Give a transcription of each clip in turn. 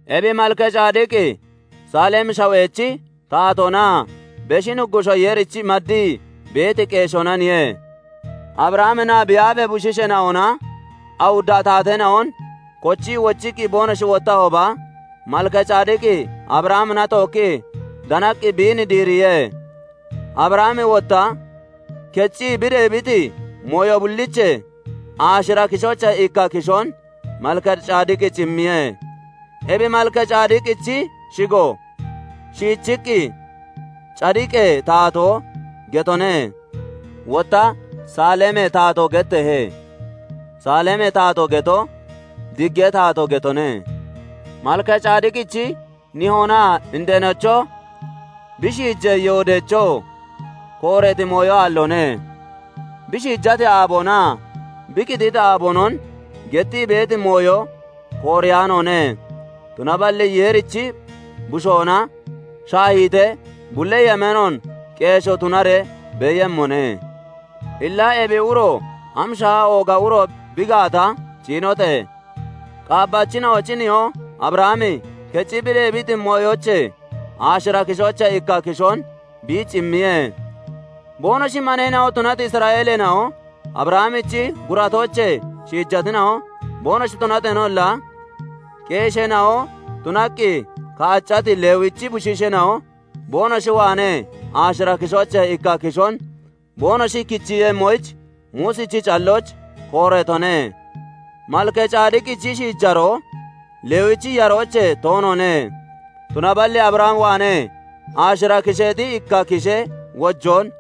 Ebi Malkacadiqi Saalemi Shawechi taatoonaa Beshi Nuggushoo Yeerich maddii beeti qeeshoonaniye. Abrahaminaa bi aafee bushiisheena'ona awudda taateena'on kochii wochiqqi boonoshi wottahooba, Malkacadiqi Abrahamina tookkii danaqqi biin diiriye. Abrahami wotta keccii bi deebiti mooyo bulliichee, aashira kishoochee ikka kishoon Malkacadiqich immiye. Ebi Malkacadiqichi shigo shiichiqqi "Cadiqee Taatoo" getone; wotta Saalemee Taatoo getteehe; "Saalemee Taatoo" geto, "Diggee Taatoo" getone. Malkacadiqichi nihoonaa indeenocho, bi shiijee yoodoochoo kooreeti mooyo aalloone; bi shiijati aaboonaa bi qititi aaboonon gettii beeti mooyo kooreyaanoone; tunaballi Yeerichi bushoona shaahiitee bulli yemeenoon qeeshoo tunaree beeyemmone. Illa ebi uro am shaaha ooga uro bi gaata ciinote! Qaabbachina'ochi nihoo Abrahami keccii bi deebiti mooyoochee aashira kishoochee ikka kishoon biich immiye. Boonoshi maneena'o tunati Isra'eeleena'o Abrahamichi guratoochee shiijatina'o boonoshi tunateenolla, qeesheena'o tunaqqi kaaccati Lewichi bushiisheena'o boonoshi waanee aashira kishoochee ikka kishoon boonoshi kichiiyemmoyich Muusichi callooch kooreetone. Malkacadiqichi shiijaroo Lewichi yaroochee toonoone; tunaballi Abraham waanee aashira kisheexi ikka kishee wojoon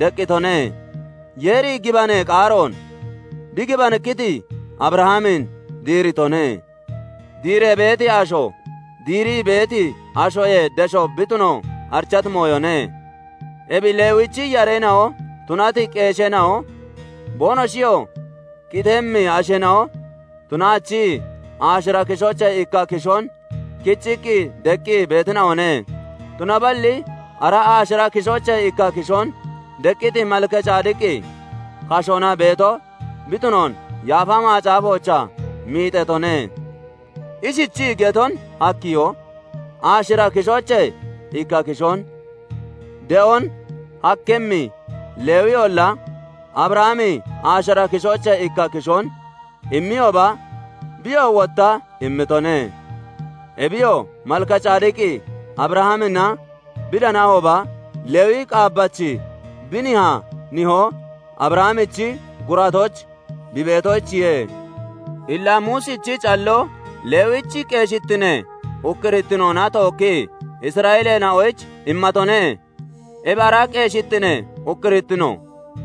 deqqitone; Yeeri gibanee qaaroon bi gibanikkiti Abrahamin diiritone. Diiree beeti asho diirii beeti ashoyee desho bi tuno arichati mooyone. Ebi Lewichi yareena'o tunati qeesheena'o, boonoshiyoo qitemmi asheena'o tunaachii, aashira kishoochee ikka kishoon kichiiqqi deqqi beetina'one; tunaballi ara aashira kishoochee ikka kishoon deqqiti Malkacadiqi kashoona beeto bi tunoon Yaafa Macaafoochaa miixeetone. Ishichii geton hakkiyo; aashira kishoochee ikka kishoon de'on hakkimmi Lewiyolla, Abrahami aashira kishoochee ikka kishoon immiyooba, biyoo wotta immitone. Ebiyoo, Malkacadiqi Abrahamina bi danahooba, Lewi qaabbachi bi nihaa nihoo Abrahamichi guratooch bi beetoyichiye. Illa Muusichi calloo Lewichi qeeshittinee ukkurittinoona tookkii Isra'eeleena'oyich immatone; ebi ara qeeshittinee ukkurittino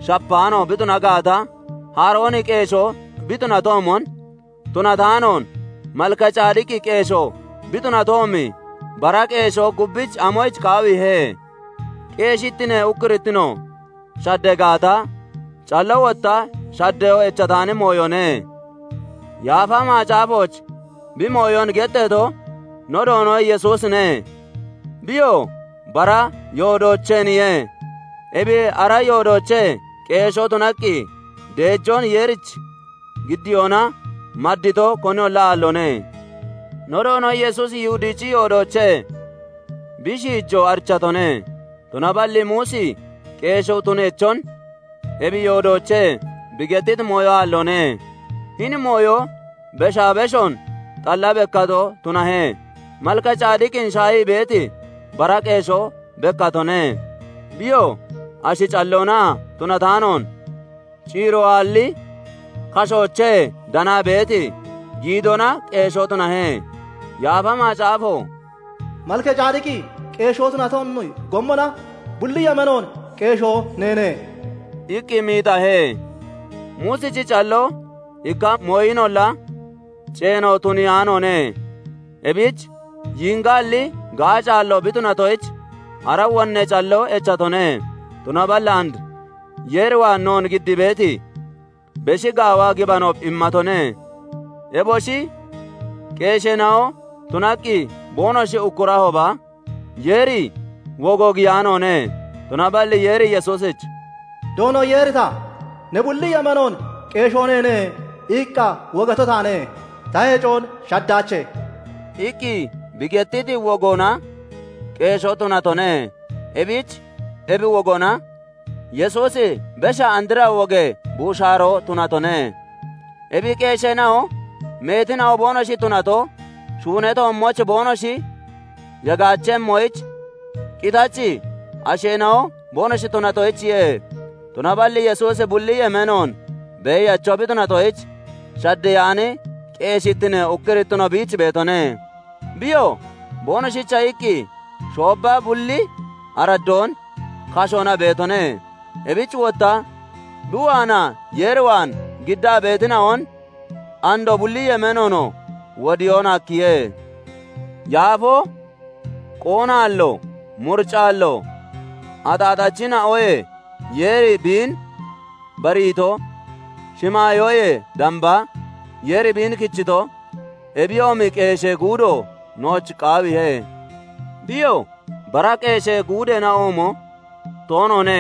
shapaano bi tunato gaata, Harooni qeeshoo bi tunatoomon tunataanoon, Malkacadiqi qeeshoo bi tunatoomi bara qeeshoo gubbich amoyich qaawiihe? Qeeshittinee ukkurittino shaddee gaata, calloo wotta shaddeyoo echataani mooyone. Yaafa Macaafooch bi mooyon getteeto, no Doono Yesuusine; biyoo bara yoodoocheeniye; ebi ara yoodoochee qeeshoo tunaqqi deejoon Yeerich giddiyoona maddito, koniyolla aalloone. No Doono Yesuusi Yihudichi yoodoochee bi shiijo arichatone; tunaballi Muusi qeeshoo tuneechon ebi yoodoochee bi gettiti mooyo aalloone. Hini mooyo beshaa beshoon xalla bekkato tunahe; Malkacadiqin shaahii beeti, bara qeeshoo bekkatone; Biyoo ashi calloona tunataanoon, ciiro aalli kashoochee danaa beeti giidoona qeeshoo tunahe. Yaafa Macaafo "Malkacadiqi qeeshoo tunatoomi gommona Bulli yemeenoon qeeshoo neene" iqqi miixahe. Muusichi calloo ikka mooyinolla ceeno tuniyaanoone; ebich yiingaalli, gaacaallo bi tunatoyich, ara wonnee calloo echatone; tunaballi and Yeer waan noon giddii beeti beshi gaawa gibano immatone. Eboshi qeesheena'o tunaqqi boonoshi ukkurahooba, Yeeri wogo giyaanoone; tunaballi Yeeri Yesuusich "Doono Yeeri ta 'Ne bulli yemeenoon qeeshoo neene' iqqa wogato taane; Ta heciyoon shaddaache" iqqi bi gettiti wogoona qeeshoo tunatone. Ebich ebi wogoona Yesuusi besha andra wogee buushaaroo tunatone. Ebi qeesheena'o meetina'o boonoshi tunato, shuunee toommooch boonoshi yagaachemmoyich qitachi asheena'o boonoshi tunatoyichiye. Tunaballi Yesuusi bulli yemeenoon beeyacho bi tunatoyich, shaddeyaani qeeshittinee ukkurittino biich beetone. Biyoo boonoshicha iqqi shoobba bulli araddoon kashoona beetone; ebich wotta bi waanaa Yeer waan giddaa beetina'on andoo bulli yemeenoonoo wodiyoon hakkiye. Yaafoo, qoonaallo, muricaallo, axaaxachina'oyee Yeeri biin bariito, shimaayoyee damba Yeeri biin kichito, ebiyoomi qeeshee guudo nooch qaawiihe. Biyoo bara qeeshee guudeena'oomo toonoone;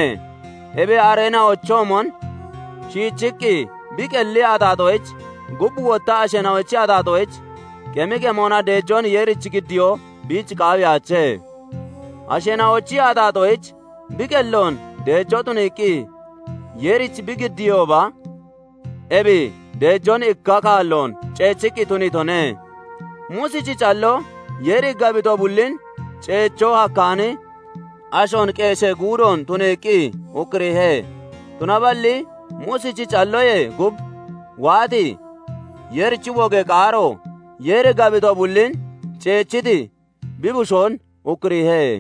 ebi areena'ochoomon shiichiqqi bi qelli axaaxoyich, gub wotta asheena'ochi axaaxoyich qemi qemona deejoon Yeerich giddiyoo biich qaawiyaache. Asheena'ochi axaaxoyich bi qelloon deejoo tuniiqqi Yeerich bi giddiihooba, ebi deejoon ikka kaalloon ceechiqqi tuniitone. Muusichi calloo Yeeri gabito bullin ceechoo hakkaani ashoon qeeshee guudoon tuniiqqi ukkuriihe; tunaballi Muusichi callooyee gub waati, Yeerichi wogee qaaro Yeeri gabito bullin ceechiti bi Bushoon ukkuriihe.